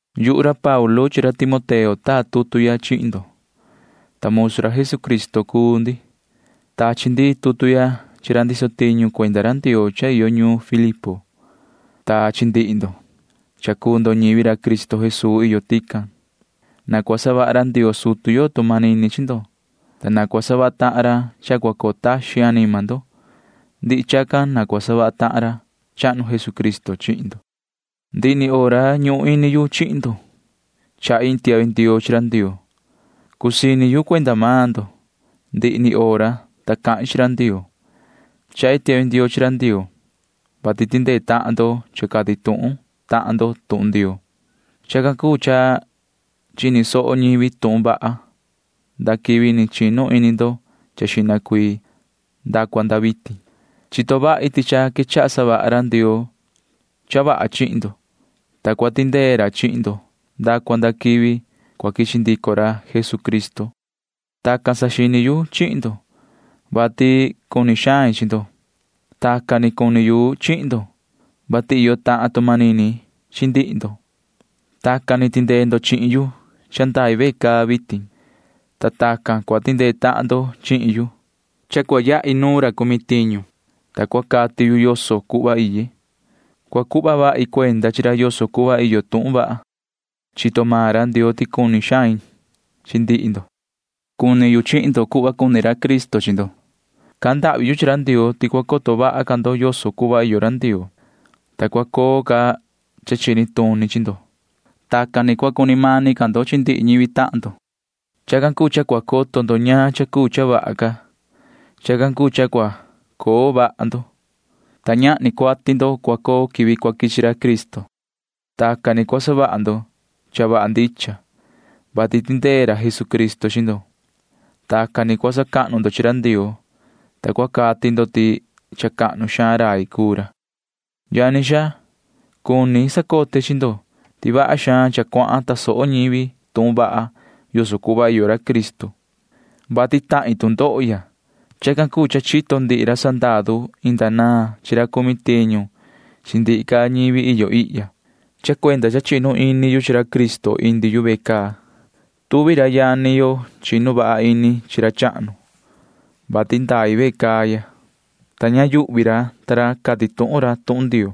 Yuhu ra Paulu chi ra Timoteo taa tutu ya chihin ndo, ta musu ra Jesucristo cuu ndi. Tachi ndi tutu ya chihin ra ndiso tiñu ra Ndioo iyo ñuun Filipo chihin ndihi ndo, ta ñivi Cristo Jesuu iyo tican cuu ndo. Na cua savaha ra Ndioo sutu yo tu manini chihin ndo, ta na cua savaha tahan ra cha cua coo taxin anima ndo. Ndihi chacan na cua savaha tahan ra chahnu Jesucristo chihin ndo. Ndihi ni hora cha ñuhun ini yu chihin ndo chahi iin tiahvi ndioo chi ra Ndioo. Cusii ini yu cuenda maan ndo ndihi ni hora cahin chi ra Ndioo. Chahi tiahvi ndioo chi ra Ndioo, vati tindee tahan ndo cha cati tuhun tahan ndo tuhun Ndioo. Chacan cuu cha chini soho ñivi tuhun vaha nda quivi ni chinu ini ndo xihna cuii nda cua nda vitin. Chito vahi ti cha quechaha savaha ra Ndioo cha vaha chihin ndo, ta ni cua tindee ra chihin ndo nda cua nda quivi cua quichi ndico ra Jesucristo. Vaha cha tacan ni saxini yu chihin ndo, vati cuni xain chi ndo. Tacan ni cuni yu chihin ndo, vati iyo tahan tu manini chi ndihi ndo. Tacan ni tindee ndo chihin yu, ta ndai ve caa ya vitin, ta tacan ni tindee tahan ndo chihin yu, ta yahi nu ra cumi tiñu, ta cati ndique yoso cuhva iye. Chaha vahi cuenda chi ra yoso cuhva iyo tuhun vaha. Chito maan ra Ndioo ti cuni xain chi ndihi ndo. Cuni yu chihin ndo cuhva cuni ra Cristo chi ndo. Cahan ndahvi yu chi ra Ndioo ti cua coto vaha ca ndo yoso cuhva iyo ra Ndioo, ta cua coo ca cha chini tuni chi ndo. Tacan ni cua cuni mani ca ndo chi ndihi ñivi tahan ndo. Chacan cuu cha cua coto ndo ñaan cha cuu cha vaha ca. Chacan cuu cha cua coo vaha ndo, ta ñahni cuati ndo cua coo quivi cua quichi ra Cristo. Tacan ni cua savaha ndo cha vaha ndicha, vati tindee ra Jesucristo chi ndo. Tacan ni cua sacahnu ndo chi ra Ndioo, ta cua cati ndo ti cha cahnu xaan rai cuu ra. Yani xaa, cuni sacote chi ndo ti vaha xaan cha cuahan tasoho ñivi tuhun vaha yoso cuhva iyo ra Cristo, vati tahin tu ndoho ya. Chacan cuu cha chito ndihi ra sandaru inda naan chi ra cumi tiñu chi ndihi ca ñivi iyo ihya. Chito ra ta ra ti cha indi yu ve caa, vati iye cuenda ra Cristo. Tuvi ra yani yo chinu vaha ini ra chi ra chahnu, vati ndai ve caa ya, ta ña yuhvi ra cati tuhun xaan ca ra tuhun Ndioo.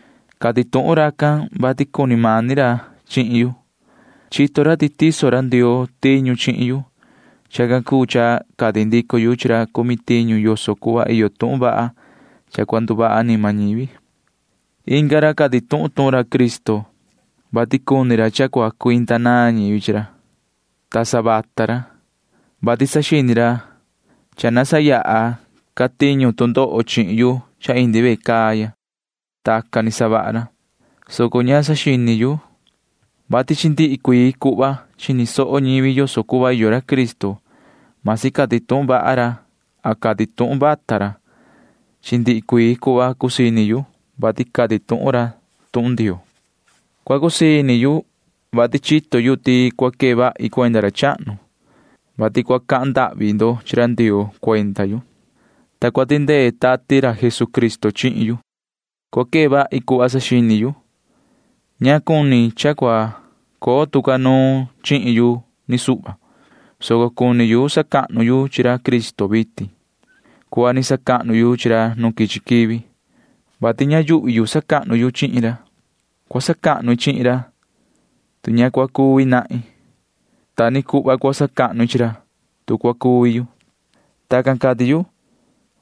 Cati tuhun racan, vati cuni mani ra chihin yu. Chito ra ti tiso ra Ndioo tiñu chihin yu. Chacan cuu cha cati ndico yu chi ra cumi tiñu yoso cuhva iyo tuhun vaha cha cua nduvaha anima ñivi. Inga ra cati tuhun ra tuhun Cristo, vati cuni ra cha cua cuinda naan ñivi chi ra. Ña ndicha ra, vati saxini ra cha cua savaha ra tu ndoho chihin yu cha indi yu ve caa ya. Tacan ni savaha ra, soco ña saxini yu, vati chi ndihi cuii cuhva chini soho ñivi yoso cuhva iyo ra Cristo―masi cati tuhun ra cha ndicha ra, masi cati tuhun ra cha ña ndicha ra. Chi ndihi cuii cuhva cusii ini yu, vati cati tuhun ra tuhun Ndioo. Cua cusii ini yu, vati chito yu ti cua quee vahi cuenda ra chahnu, vati cua cahan ndahvi ndo chi ra Ndioo cuenda yu, ta cua tindee vaha ra Tati ra Jesucristo chihin yu. Cua quee vahi cuhva saxini yu. Cuni yu cha ña cua coo tu ca nuun chihin yu ni suhva, soco cuni yu sacahnu yu chi ra Cristo vitin cuhva ni sacahnu yu chi ra nu quichi quivi, vati ña yuhvi yu sacahnu yu chihin ra. Cua sacahnu i chihin ra, tu ni vii cua coo ndito yu. Ta ni cuhva cua sacahnu i chi ra, tu cua cuvi yu. Tacan cati yu,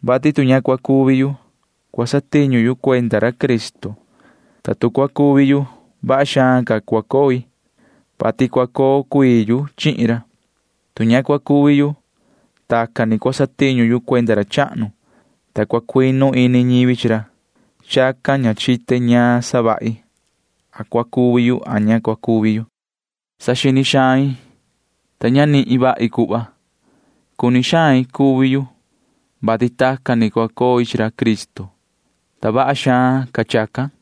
vati tu ña cua cuvi yu, cua satiñu yu cuenda ra Cristo, ta tu cua cuvi yu, vaha xaan ca cua coi, [vati cua coo cuii yu chihin ra]. Tu ña cua cuvi yu, tacan ni cua satiñu yu cuenda ra chahnu, ta cua cuinu ini ñivi chi ra, soco ña chite a cuni yu cuvi yu a ña cuni yu cuvi yu. Saxini xain, soco ña nihin vahi cuhva. Cuni xain cuvi yu, vati tacan ni cua coi chi ra Cristo, ta vaha xaan ca chacan,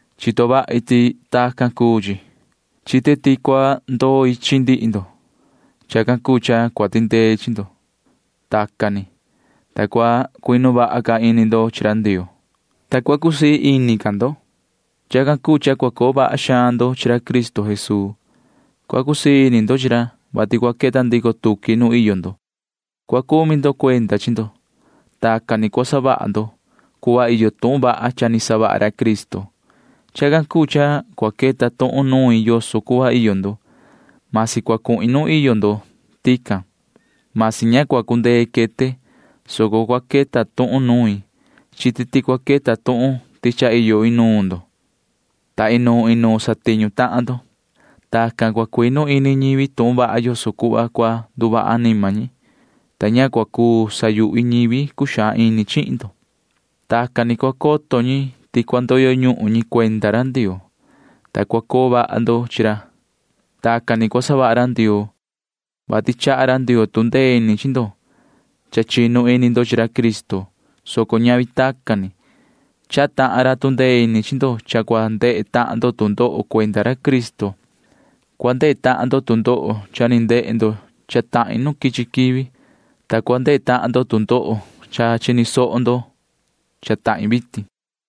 Chito vahi ti tacan cuu chi. Chite ti cua ndoi chi ndihi ndo. Chacan cuu cha cua tindei chi ndo. Tacan ni, ta cua cuinu vaha ca ini ndo chi ra Ndioo, ta cua cusii ca ini ndo. Chacan cuu cha vaha xaan ca cua coo ndo chi ra Cristo Jesuu. Cua cusii ini ndo chi ra, vati cua queta ndico tuqui nuun iyo ndo. Cua saha ndo cuenda chi ndo. Tacan ni cua savaha ndo cuhva iyo tuhun vaha cha ni savaha ra Cristo. Chacan cuu cha cua queta tuhun nuin yoso cuhva iyo ndo―vasi cua quete nuun iyo ndo tican, vasi ña cua cundee quete, soco cua queta tuhun nuin. Chite ti cua queta tuhun ti cha iyo inuun ndo, ta inuun inuun satiñu tahan ndo. Tacan cua cuinu ini ñivi tuhun vaha yoso cuhva cua nduvaha anima ñi, ta ña cua cuu sayuhvi ñivi cuxaan ini chihin ndo. Tacan ni cua coto ñi ti cua ndoyo ñuhun maan ñi cuenda ra Ndioo, ta cua coo vaha ndo chi ra. Tacan ni cua savaha ra Ndioo, vati chaha ra Ndioo tu ndee ini chi ndo cha chinu ini ndo chi ra Cristo, soco ñavi tacan ni. Chaha tahan ra tu ndee ini chi ndo cha cua ndehe tahan ndo tu ndoho cuenda ra Cristo. Cua ndehe tahan ndo tu ndoho cha ni ndehe ndo cha tahin nu quichi quivi, ta cua ndehe tahan ndo tu ndoho cha chini soho ndo cha tahin vitin.